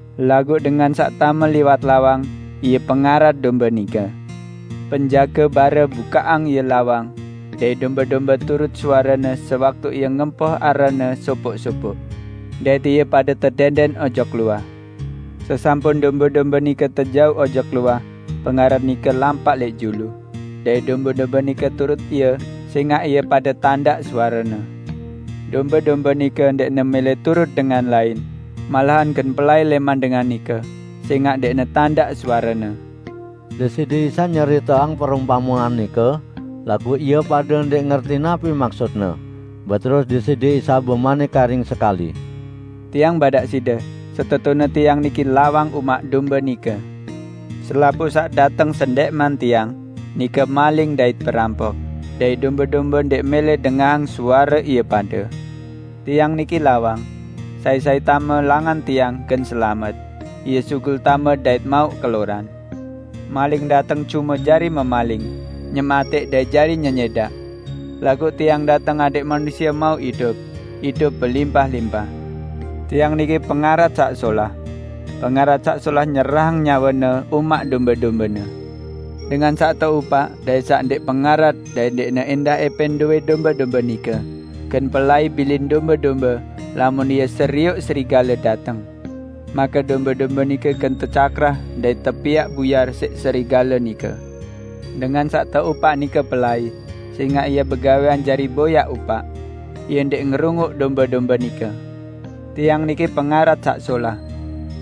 Laguq dengan saq tame liwat lawang, ie pengarat dombe nike. Penjage bare bukaqang ie lawang, dait dombe-dombe turut suarene sewaktu ie ngempoh aranne sopoq-sopoq, dait ie pade tedẽndẽn ojok luah. Sesampun dombe-dombe nike tejauq ojok luah, pengarat nike lampaq lẽq julu, dait dombe-dombe nike turut ie sẽngaq ie pade tandaq suarene. Dombe-dombe nike ndẽqne mẽlẽ turut dengan lain, malahan gen pelai lẽman dengan nike, sẽngaq ndẽqne tandaq suarene." Deside Isa nyeriteang perumpamean nike, laguq ie pade ndẽq ngerti napi maksut-Ne. Beterus Deside Isa bemanik karing sekali, "Tiang badaq side setetune Tiang niki lawang umaq dombe nike. Selapuq saq dateng sendẽqman Tiang, nike maling dait perampok, dait dombe-dombe ndẽq mẽlẽ dengahang suare ie pade. Tiang niki lawang. Sai-sai tame langan Tiang gen selamet; ie sugul tame dait mauq keloran. Maling dateng cume jari memaling, nyematẽq dait jari nyenyẽdaq. Laguq Tiang dateng adẽq manusie mauq idup -- idup belimpah-limpah. Tiang niki pengarat saq solah. Pengarat saq solah nyerahang nyawene umaq dombe-dombene. Dengan saq teupaq dait saq ndẽq pengarat dait ndẽqne ẽndah ẽpẽn dowẽ dombe-dombe nike, gen pelai bilin dombe-dombe lamun ie serioq serigale dateng. Make dombe-dombe nike gen tecakrah dait tepiaq buyar siq serigale nike. Dengan saq teupaq nike pelai, sẽngaq ie begawẽan jari boyaq upaq. Ie ndẽq ngerunguq dombe-dombe nike. Tiang niki pengarat saq solah.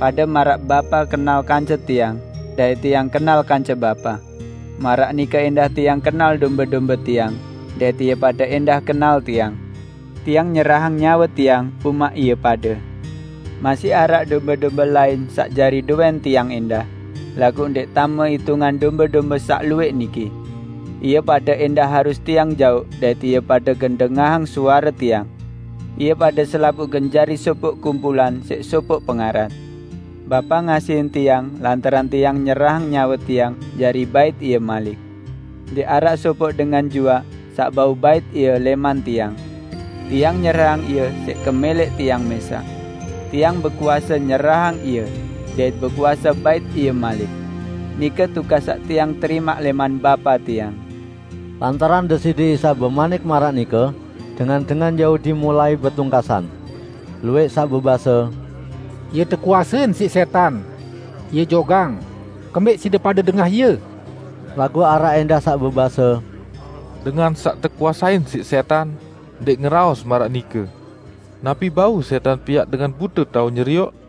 Pade maraq Bapa kenal kance Tiang dait Tiang kenal kance Bapa, maraq nike ẽndah Tiang kenal dombe-dombe Tiang dait ie pade ẽndah kenal Tiang. Tiang nyerahang nyawe Tiang umaq ie pade. Masih araq dombe-dombe lain saq jari dowẽn Tiang ẽndah, laguq ndẽq tame itungan dombe-dombe saq luwẽq niki. Ie pade ẽndah harus Tiang jauq dait ie pade gen dengahang suare Tiang. Ie pade selapuq gen jari sopoq kumpulan siq sopoq pengarat. Bapa ngasihin Tiang lantaran Tiang nyerahang nyawe Tiang jari bait ie malik. Ndẽq araq sopoq dengan juaq saq bau bait ie lẽman Tiang. Tiang nyerahang ie siq kemẽlẽq Tiang mẽsaq. Tiang bekuase nyerahang ie, dait bekuase bait ie malik. Nike tugas saq Tiang terimaq lẽman Bapa Tiang." Lantaran Deside Isa bemanik maraq nike, dengan-dengan Yahudi mulai betungkasan. Luwẽq saq bebase, "Ie tekuasein siq sẽtan! Ie jogang! Kembẽq side pade dengah Ie?" Laguq araq ẽndah saq bebase, "Dengan saq tekuasein siq sẽtan ndẽq ngeraos maraq nike! Napi bau sẽtan piaq dengan bute tao nyerioq?"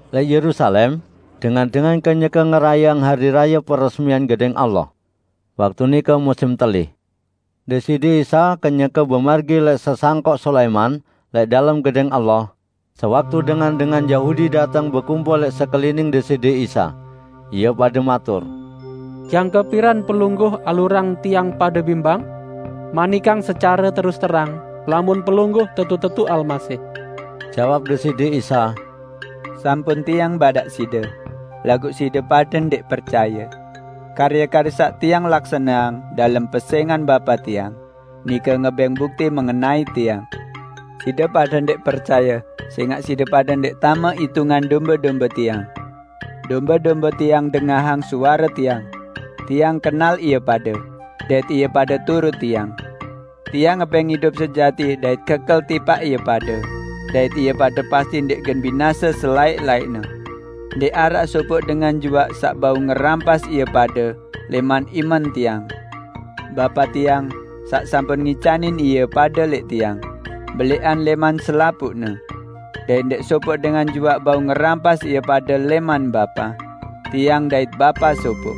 Lẽq Yerusalem dengan-dengan kenyeke ngerayeang Hari Raye Peresmian Gedẽng Allah. Waktu nike musim telih. Deside Isa kenyeke bemargi lẽq Sesangkok Sulaiman lẽq dalem Gedẽng Allah, sewaktu dengan-dengan Yahudi dateng bekumpul lẽq sekelining Deside Isa. Ie pade matur, "Jangke piran Pelungguh alurang tiang pade bimbang? Manikang secare terus terang, lamun Pelungguh tetu-tetu Almasih." Jawab Deside Isa, "Sampun Tiang badaq side, laguq side pade ndẽq percaye. Karye-karye saq Tiang laksaneang dalem pesẽngan Bapa Tiang, nike ngebẽng bukti mengenai Tiang. Side pade ndẽq percaye sẽngaq side pade ndẽq tame itungan dombe-dombe Tiang. Dombe-dombe Tiang dengahang suare Tiang. Tiang kenal ie pade, dait ie pade turut Tiang. Tiang ngebẽng idup sejati dait kekel tipaq ie pade dait ie pade pasti ndẽq gen binase selaẽq-laẽqne. Ndẽq araq sopoq dengan juaq saq bau ngerampas ie pade lẽman imen Tiang. Bapa Tiang, saq sampun ngicanin ie pade lẽq Tiang, belẽqan lẽman selapuqne. Dait ndẽq sopoq dengan juaq bau ngerampas ie pade lẽman Bapa. Tiang dait Bapa sopoq."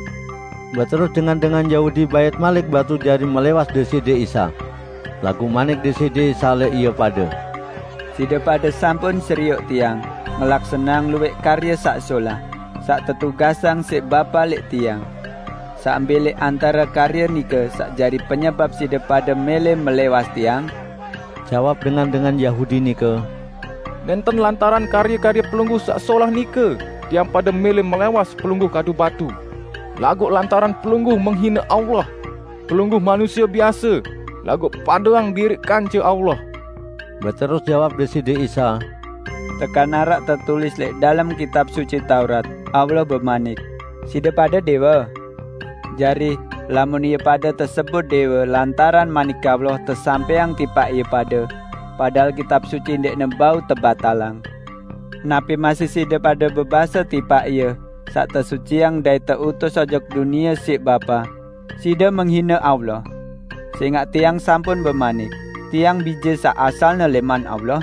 Beterus dengan-dengan Yahudi bait malik batu jari melẽwas Deside Isa. Laguq manik Deside Isa lẽq ie pade, "Side pade sampun serioq Tiang ngelaksaneang luwẽq karye saq solah, saq tetugasang siq Bapa lẽq Tiang. Saq mbẽ lẽq antare karye nike saq jari penyebap side pade mẽlẽ melẽwas Tiang?" Jawab dengan-dengan Yahudi nike, "Nẽnten lantaran karye-karye Pelungguh saq solah nike tiang pade mẽlẽ melẽwas Pelungguh kadu batu, laguq lantaran Pelungguh menghine Allah. Pelungguh manusie biase, laguq padeang diriq kance Allah?" Beterus jawab Deside Isa, "Tekan araq tetulis lẽq dalem Kitab Suci Taurat, Allah bemanik, 'Side pade dẽwe'? Jari, lamun ie pade tesebut dẽwe lantaran Manik Allah tesampẽang tipaq ie pade -- padahal Kitab Suci ndẽqne bau tebatalang --, napi masih side pade bebase tipaq Ie saq tesuciang dait teutus ojok dunie siq Bapa: Side menghine Allah! Sẽngaq Tiang sampun bemanik, "Tiang Bije saq asalne lẽman Allah?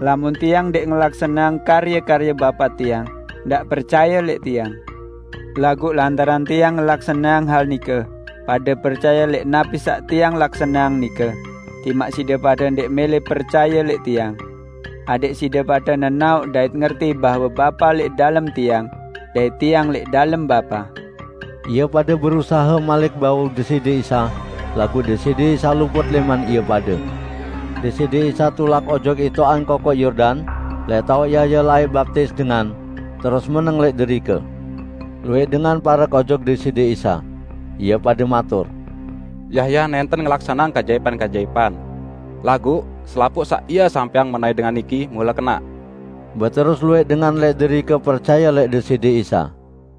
Lamun Tiang ndẽq ngelaksaneang karye-karye Bapa Tiang, ndaq percaye lẽq Tiang. Laguq lantaran Tiang ngelaksaneang hal nike, pade percaye lẽq napi saq Tiang laksaneang nike, timaq side pade ndẽq mẽlẽ percaye lẽq Tiang. Adẽq side pade nenaoq dait ngerti bahwe Bapa lẽq dalem Tiang, dait Tiang lẽq dalem Bapa." Ie pade berusahe malik bau Deside Isa, laguq Deside Isa luput lẽman ie pade. Deside Isa tulak ojok itoqan Kokoq Yordan, lẽq taoq Yahya laẽq baptis dengan, terus meneng lẽq derike. Luwẽq dengan parek ojok Deside Isa. Ie pade matur, "Yahya nẽnten ngelaksaneang keajaipan-keajaipan, laguq selapuq saq ie sampẽang mengenai dengan niki mule kenaq." Beterus luwẽq dengan lẽq derike percaye lẽq Deside Isa.